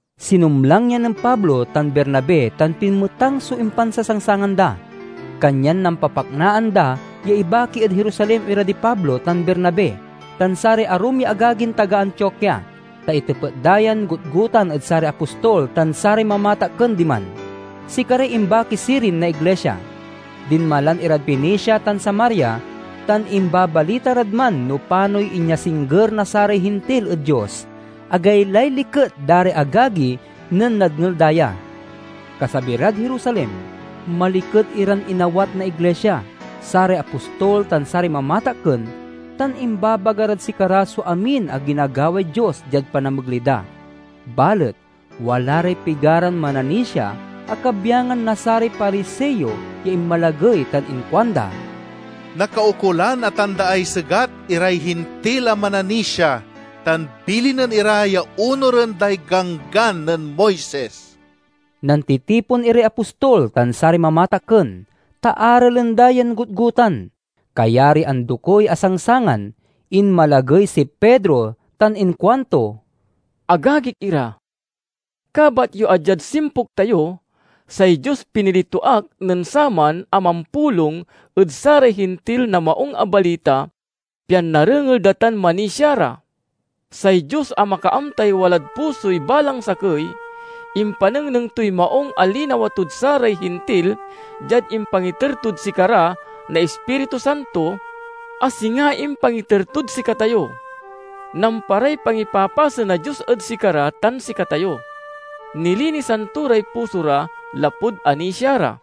Sinumlang ya nen Pablo tan Bernabe tan pinmetang so impansasangsangan da. Kanyan nampapaknaan da ya ibaki ed Jerusalem ira di Pablo tan Bernabe tan saray arum ya agagin taga Antiokia, ta itepet da yan gotgotan ed saray apostol tan saray mamatakken diman. Sikaray imbaki sirin na iglisia. Dinmalan irad Fenicia tan Samaria, tan imbabalita rad man no panoy inyasingger na saray Hintil ed Dios. Agaylay liket da ray agagi nen nadngel da ya. Kasabi rad Jerusalem, maliket iran inawat na iglisia, saray apostol, tan saray mamatakken, tan imbabaga rad sikara so amin a ginagaway Dios diad panamegley da. Balet wala ray pigaran mananisia a kabyangan na saray Pariseo ya inmalagey tan inkuanda, "Nakaukolan a tandaay segat iray Hintil a mananisia, tan bilinen ira ya onuren day Ganggan nen Moises." Nantitipon iray apostol tan saray mamatakken, ta aralen da yan gotgotan. Kayariy andokey a sangsangan, inmalagey si Pedro tan inkuanto, "Agagik ira, kabat yo a diad simpuk tayo, say Dios pinili to ak nen saman a mampulong ed saray Hintil na Maung a Balita, pian narengel da tan manisia ra. Say Dios, a makaamtay walad pusoy balang sakey, impanengneng toy maung a linawa tod saray Hintil diad impangiter tod sikara na Ispiritu Santo, a singa impangiter tod sikatayo. Namparay pangipapasen na Dios ed sikara tan sikatayo. Nilinisan to ray puso ra lapud anisia ra.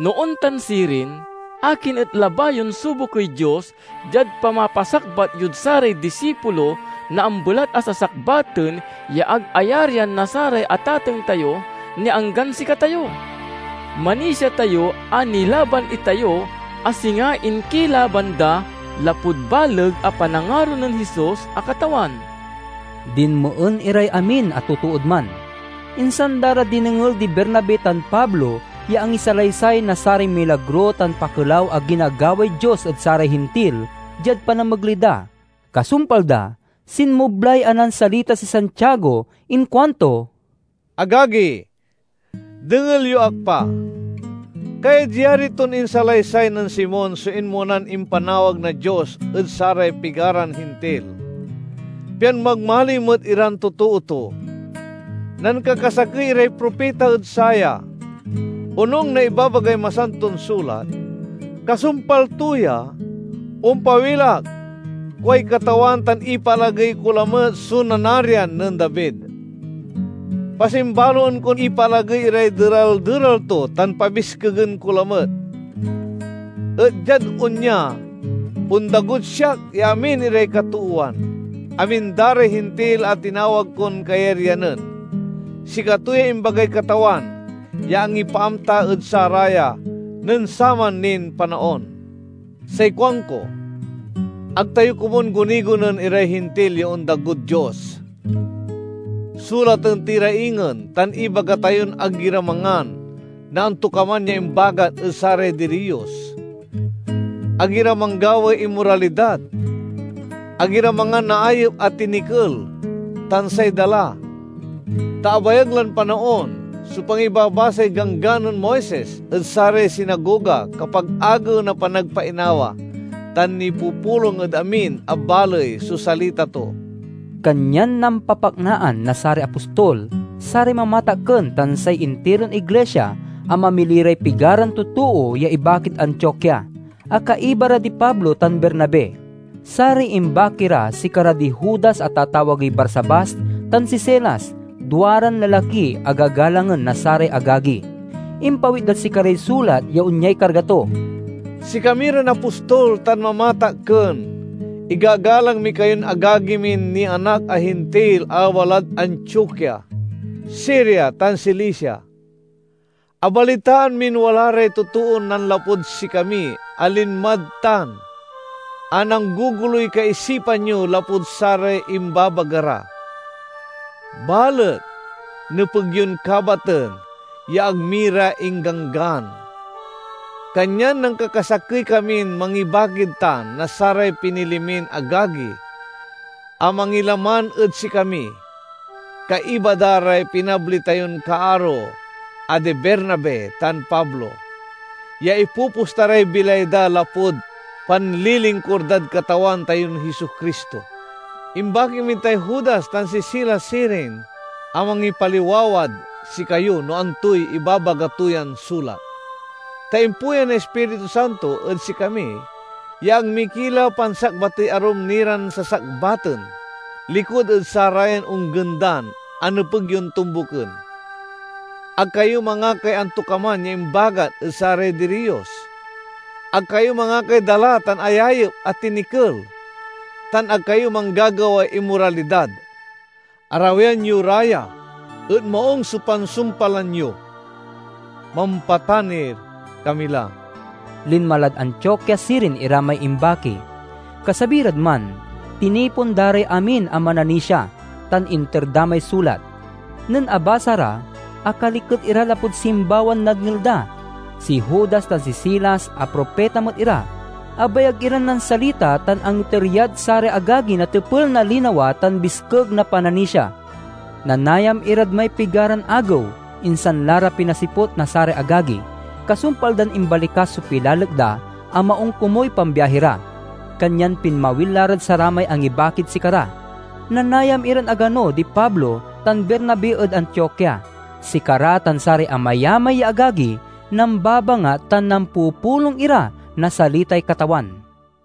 No ontan sirin, akin et labay yon subokey Dios diad pamapasakbat yod saray disipulo na ambelat a sasakbaten ya ag ayarian na saray atateng tayo, ni anggan sikatayo? Manisia tayo a nilaban itayo a singa inkilaban da, lapud baleg a panangaro nen Jesus a Katawan." Dinmeen iray amin a totood man. Insan da ra dinengel di Bernabe tan Pablo ya angisalaysay na saray milagro tan pakelaw a ginagaway Dios ed saray Hintil, diad panamegley da. Kasumpal da, sinmoblay a nansalita si Santiago. Inkuanto, "Agagi, dengel yo ak pa. Kayadyari ton insalaysay nen Simon so inmonan impanawag na Dios ed saray pigaran Hintil, pian magmaliw met iran totoo to. Nankakasakey iray propita ed saya. Onung na ibabagay Masanton Sulat, 'Kasumpal to ya, ompawil ak, kuay Katawan tan ipaalagey ko lamet so nanarian nen David. Pasimbaloen kon ipaalagey iray deral-deral to tan pabiskegen ko lamet. Et diad onya ondagod siak ya amin iray katoowan, amin da ray Hintil a tinawag kon kayaryanen. Sikato yay imbagay Katawan, ya angipaamta ed saraya nen saman nin panaon.' "Say kuanto, ag tayo komun gunigonen iray Hintil ya ondagod Dios. Sulaten ti ra ingen tan ibaga tayon ag ira mangan na antokaman ya imbagat ed saray diriyos; ag ira manggaway inmoralidad; ag ira mangan na ayep a tinikel, tan say dala. Ta abayag lan panaon so pangibabasay Ganggan nen Moises ed saray sinagoga kapag Agew na Panagpainawa, tan nipupulong ed amin a baley so salita to." Kanyan nampapaknaan na saray apostol, saray mamatakken, tan say intiron iglisia a mamili ray pigaran totoo ya ibakid Antiokia, a kaiba ra di Pablo tan Bernabe. Saray imbaki ra sikara di Judas a tatawagey Barsabas tan si Silas, duaran lalaki a gagalangen na saray agagi. Impawit dad sikaray sulat ya onyay karga to: "Sikami ran apostol tan mamatakken igagalang mi kayon agagi min nianak a Hintil a walad Antiokia, Siria, tan Cilicia. Abalitaan min wala ray totoon nanlapud sikami a linmad tan a nanggogoloy kaisipan yo lapud saray imbabaga ra. Balet nepeg yon kabaten ya ag mi ra ingganggan. Kanyan nankakasakey kamin mangibakid tan na saray pinili min agagi a mangilaman ed sikami. Kaiba da ray pinabli tayon kaaro a di Bernabe tan Pablo, ya ipoposta ray bilay da lapud panlilingkur dad Katawan tayon Jesu-Cristo. Imbaki mid tay Judas tan si Silas sirin a mangipaliwawad sikayo no antoy ibabaga to yan sulat. Ta impuyan na Ispiritu Santo ed sikami ya ag mi ki la pansakbatey arum ni ran sasakbaten, likud ed sarayan onggendan a nepeg yon tombuken: ag kayo mangakay antokaman ya imbagat ed saray diriyos; ag kayo mangakay dala tan ayayep a tinikel; tan ag kayo manggagaway inmoralidad. Arawian yo ra ya et maung so pansumpalan yo. Mampatanir kami la." Linma lad Antiokia sirin ira may imbaki. Kasabi rad man, tinipon da ray amin a mananisia, tan inter da may sulat. Nen abasa ra, akaliket ira lapud simbawan nadngel da. Si Judas tan si Silas, a propita met ira, abayag iran nansalita tan angiter yad saray agagi na tepel na linawa tan biskeg na pananisia. Nanayam irad may pigaran agew, insan la ra pinasiput na saray agagi, kasumpal dan imbalikas so pilalek da a maung komuy pambiahi ra. Kanyan pinmawil la rad saramay angibakid sikara. Nanayam iran agano di Pablo tan Bernabe ed Antiokia. Sikara tan saray amayamay ya agagi nambabangat tan nampupulong ira na salitay Katawan.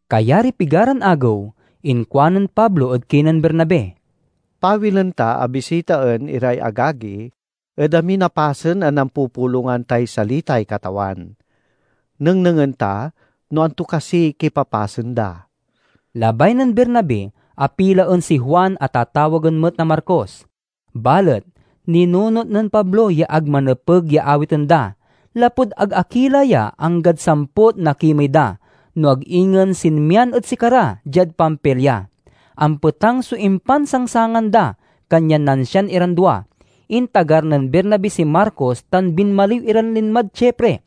Kayariy pigaran agew, inkuanen Pablo ed kinen Bernabe, "Pawilen ta a bisitaen iray agagi ed amin a pasen a nampupulongan tay salitay Katawan. Nengnengen ta no anto kasiy kipapasen da." Labay nen Bernabe a pilaen si Juan a tatawagen met na Marcos, balet ninunot nen Pablo ya ag manepeg ya awiten da, lapud ag akila ya anggad samput na kimey da, no ag ingen sinmian ed sikara diad Pamfilia. Ampetang so impansangsangan da, kanyan nansian iran dua. Intagar nen Bernabe si Marcos tan binmaliw iran linmad Chipre.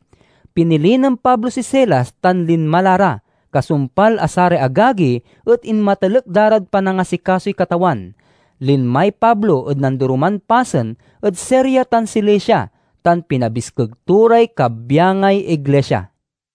Pinili nen Pablo si Silas tan linma la ra, kasumpal a saray agagi et inmatalek da rad panangasikasoy Katawan. Linmay Pablo ed nandoroman pasen ed Siria tan Cilicia, tan pinabiskeg to ray kabyangay iglisia.